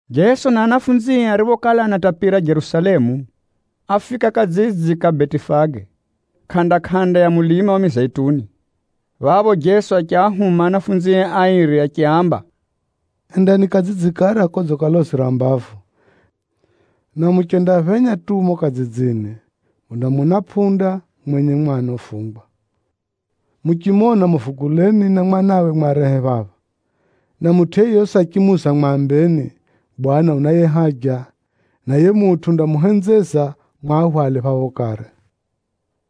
Jeso na ahumwae ariphokala anatapira Jerusalemu, áfika kadzidzi kariko kuko Betifage, kʼanda-kʼanda ya mulima wa Mizeituni. Phapho Jeso achiahuma ahumwae airi achiaamba, “Endani kadzidzi kara kodzikalozera mbavu, na muchendaphenya tu mumo kadzidzini, mundamona pʼunda mwenye mwana ufungwa. Muchimona, muvuguleni na mwanawe mwarehe phapha. Na mutʼu yeyosi achimuuza mwambeni, ‘Bwana unaye haja,’ na yiye mutʼu undamuhenzeza mwahwale phapho kare.”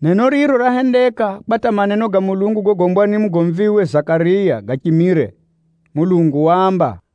Neno riro rahendeka kwa hata maneno ga Mulungu gogombwa ni mugomviwe Zakariya gachimire. Mulungu waamba,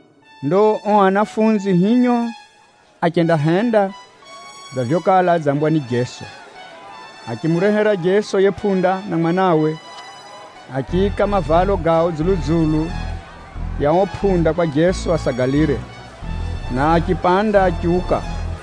Ndo ao ahumwa hinyo, achendahenda dza vyokala adzambwa ni Jeso. Achimurehera Jeso yiye pʼunda na mwanawe, achiika mavalo gao dzulu-dzulu ya ao pʼunda kwa Jeso asagalire, na achipanda achiuka.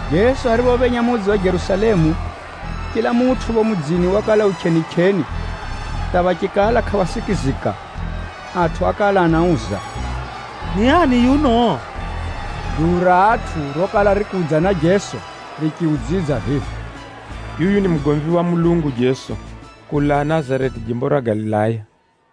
Jeso ariphophenya mudzi wa Jerusalemu, chila mutʼu phapho mudzini wakala u chʼenichʼeni hata phachikala kʼaphasikizika. Atʼu ákala anauza, “Ni ani yuno?” Duu ra atʼu rokala rikudza na Jeso richiudzidza vivi, “Yuyu ni mugomvi wa Mulungu Jeso, kulaa Nazareti jimbo ra Galilaya.”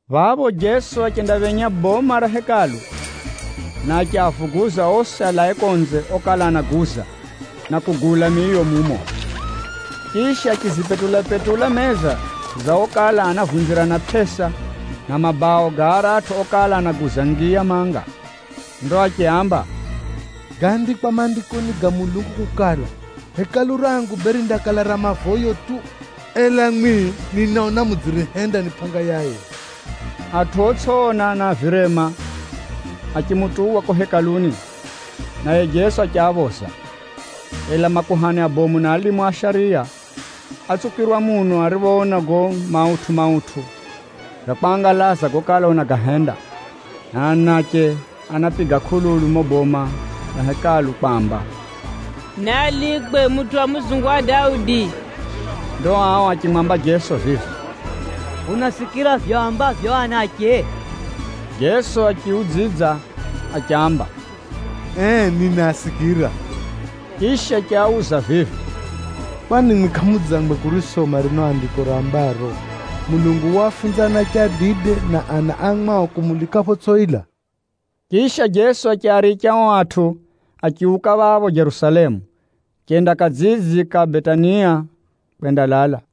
Phapho Jeso achendaphenya boma ra Hekalu, na achiavuguza osi alae konze okala anaguza, na kugula miyo mumo. Chisha, achizipetula-petula meza za okala anavunzirana pʼesa, na mabao ga aratʼu okala anaguza ngiya manga. Ndo achiaamba, “Gaandikwa Maandikoni ga Mulungu kukala, ‘Nyumba yangu yindaihiwa nyumba ya mavoyo.’ Ela mwimwi, ninaona mudziyihenda ni pʼanga ya aivi!” Atʼu otsʼiona, na a virema achimutuwa kuko Hekaluni, naye Jeso achiaphoza. Ela makuhani abomu na alimu a shariya átsukirwa muno ariphoona gago mautʼu-mautʼu ga kwangalaza gokala unagahenda, na anache anapiga kʼululu mumo boma ra Hekalu kwamba, “Naalikwe mutʼu wa mudzungu wa Daudi!” Ndo ao achimwamba Jeso vivi, “Unasikira vivyo aambavyo ao anache?” Jeso achiaudzidza achiaamba, “Ee, ninaasikira!” Chisha achiauza vivi, “Kwani mwimwi kʼamudzangwe kurisoma rino Andiko rambaro, ‘Uwe waafunza ana atsanga na anache adide kukulika’?” Chisha Jeso achiaricha ao atʼu, achiuka phapho Jerusalemu, achenda kadzidzi kariko kuko Betania kwendalala.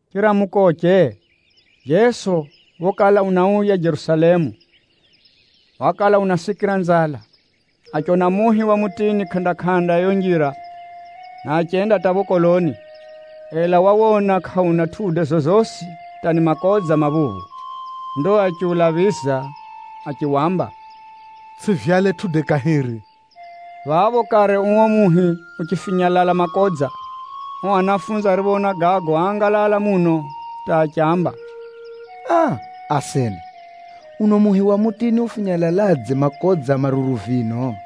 Chiramukoche, Jeso phokala unauya Jerusalemu, wakala unasikira nzala. Achiona muhi wa mutini kʼanda-kʼanda ya yiyo njira, na achenda hata phapho koloni, ela wawona kʼauna matunda gogosi, hata ni makodza maphuphu. Ndo achiulaphiza achiwamba, “Tsʼivyale tʼude kahiri!” Phapho kare uo mutini uchifinyalala makodza. Ao ahumwa ariphoona gago áangalala muno hata achiamba, “Aa! Asena, uno muhi wa mutini ufinyalaladze makodza maruru vino?”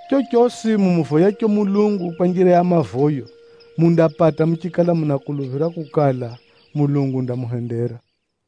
Chochosi mumuvoyacho Mulungu kwa njira ya mavoyo, mundapata muchikala munakuluphira kukala, Mulungu undamuhendera.”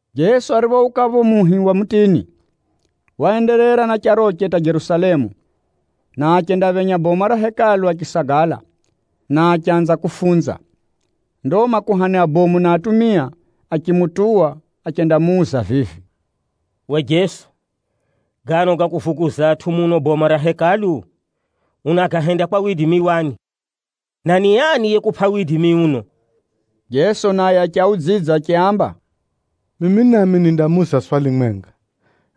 Jeso ariphouka phapho phenye muhi wa mutini, waenderera na charoche hata Jerusalemu, na achendaphenya boma ra Hekalu achisagala, na achanza kufunza. Ndo makuhani abomu na atumia achimutuwa achendamuuza vivi, “Uwe Jeso, gano ga kuvuguza atʼu muno boma ra Hekalu, unagahenda kwa widimi wani? Na ni ani yekupʼa widimi uno?” Jeso naye achiaudzidza achiaamba, “Mimi nami nindamuuza swali mwenga,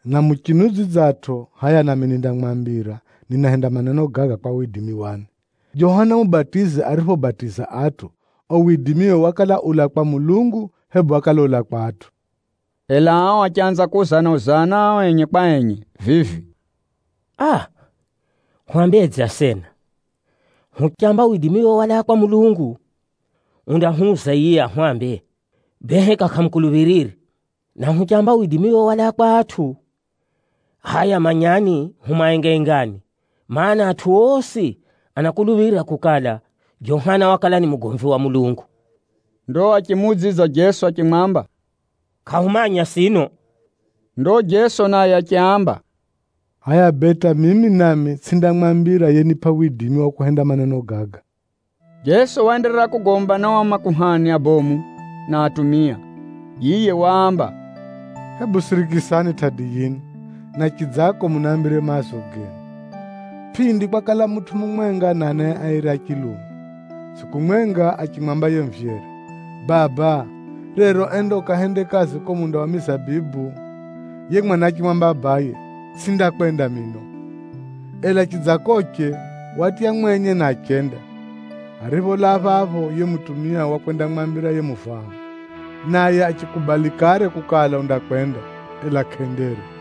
na muchiudzidzatʼo, hʼaya nami nindamwambira ninahenda maneno gaga kwa widimi wani. Johana Mubatizi ariphobatiza atʼu, uo widimiwe wakala ulaa kwa Mulungu, hebu wakala ulaa kwa atʼu?” Ela ao achanza kuuzana-uzana ao enye kwa enye vivi, “Aa! Hwambedze asena? Huchamba widimiwe walaa kwa Mulungu, undahwuza yiye ahwambe, ‘Bee heka kʼamumukuluphirire?’ Na huchamba, ‘Widimiwe walaa kwa atʼu,’ hʼaya manyani hu maengaengani. Maana, atʼu osi anakuluphira kukala, Johana wakala ni mugomvi wa Mulungu.” Ndo achimuudzidza Jeso achimwamba, “Kʼahumanya sino.” Ndo Jeso naye achiaamba, “Hʼaya bee hata mimi nami tsʼindamwambira yenipʼa widimi wa kuhenda maneno gaga.” Jeso waenderera kugomba na ao makuhani abomu na atumia. Yiye waamba, “Hebu sirikisani tʼadi yino, na chidzako munambire maazo genu. Pʼindi kwakala mutʼu mumwenga na anae airi a chilume. Tsʼiku mwenga, achimwamba yiye muvyere, ‘Baba, rero enda ukahende kazi kuko munda wa mizabibu.’ Yiye mwana achimwamba abaye, ‘Tsʼindakwenda mino!’ Ela chidzakoche, watya mwenye na achenda. Aripholaa phapho, yiye mutumia wakwendamwambira yiye muvaha, naye achikubali kare kukala undakwenda, ela kʼendere.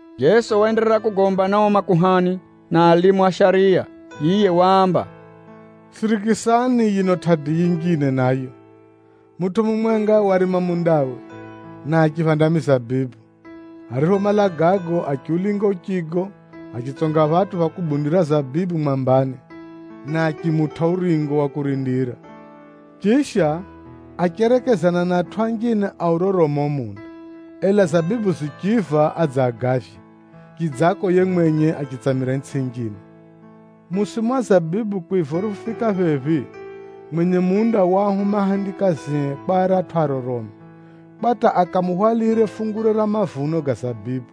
Jeso waenderera kugomba na ao makuhani na alimu a shariya. Yiye waamba, “Sirikisani yino tʼadi yinjine nayo. Mutʼu mumwenga warima mundawe, na achiphanda mizabibu. Ariphomala gago achiulinga uchigo, achitsonga phatʼu pha kubundira zabibu mwambani, na achimutʼa uringo wa kurindira. Chisha, acherekezana na atʼu anjine aurorome uo munda, ela zabibu zichiiva adze agavye, chidzako yiye mwenye achitsamira itsʼi yinjine. Musimu wa zabibu kwiva uriphofika phephi, mwenye munda waahuma ahendikazie kwa aratʼu aroromi, kwa hata akamuhwalire fungure ra mavuno ga zabibu.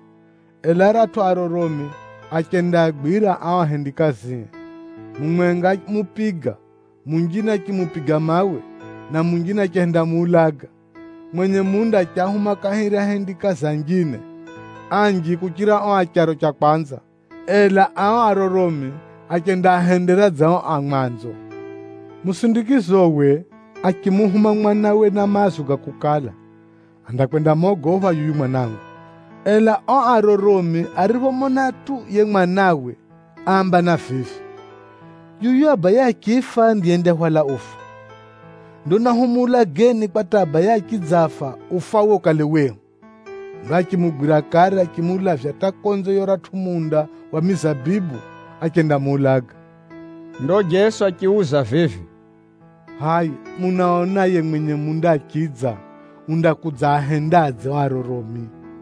Ela aratʼu aroromi achendaagwira ao ahendikazie. Mumwenga ámupiga, munjine achimupiga mawe, na munjine achihendamuulaga. Mwenye munda achiahuma kahiri ahendikazi anjine, anji kuchira ao acharo cha mwanzo, ela ao aroromi achendaahendera dza ao a mwanzo. Musindikizowe, achimuhuma mwanawe na maazo ga kukala, ‘Andakwendamogopha yuyu mwanangu.’ Ela ao aroromi ariphomona tu yiye mwanawe, áambana vivi, ‘Yuyu abaye achifa ndiye yendahwala ufa. Ndo nahumuulageni kwa hata abaye achidzafa, ufawe ukale wehu!’ Ndo achimugwira kare achimulavya hata konze ya uratʼu munda wa mizabibu, achendamuulaga.” Ndo Jeso achiuza vivi, “Hʼaya munaona yiye mwenye munda achidza, undakudzaahendadze ao aroromi?”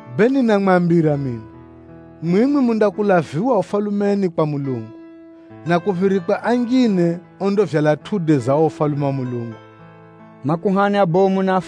“Kwa vivyo ninamwambira kamare mino, mwimwi mundakulaviwa kuko Ufalumeni kwa Mulungu, na kuphirikwe anjine ondavyala matunda ga uo Ufalume wa Mulungu.” Nakala zinjine zinaonjeza fungu ra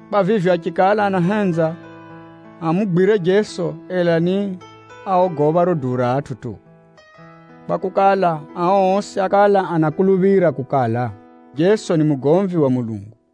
Kwa vivyo, achikala anahenza amugwire Jeso, ela ni áogopha riro duu ra atʼu tu, kwakukala, ao osi ákala anakuluphira kukala, Jeso ni mugomvi wa Mulungu.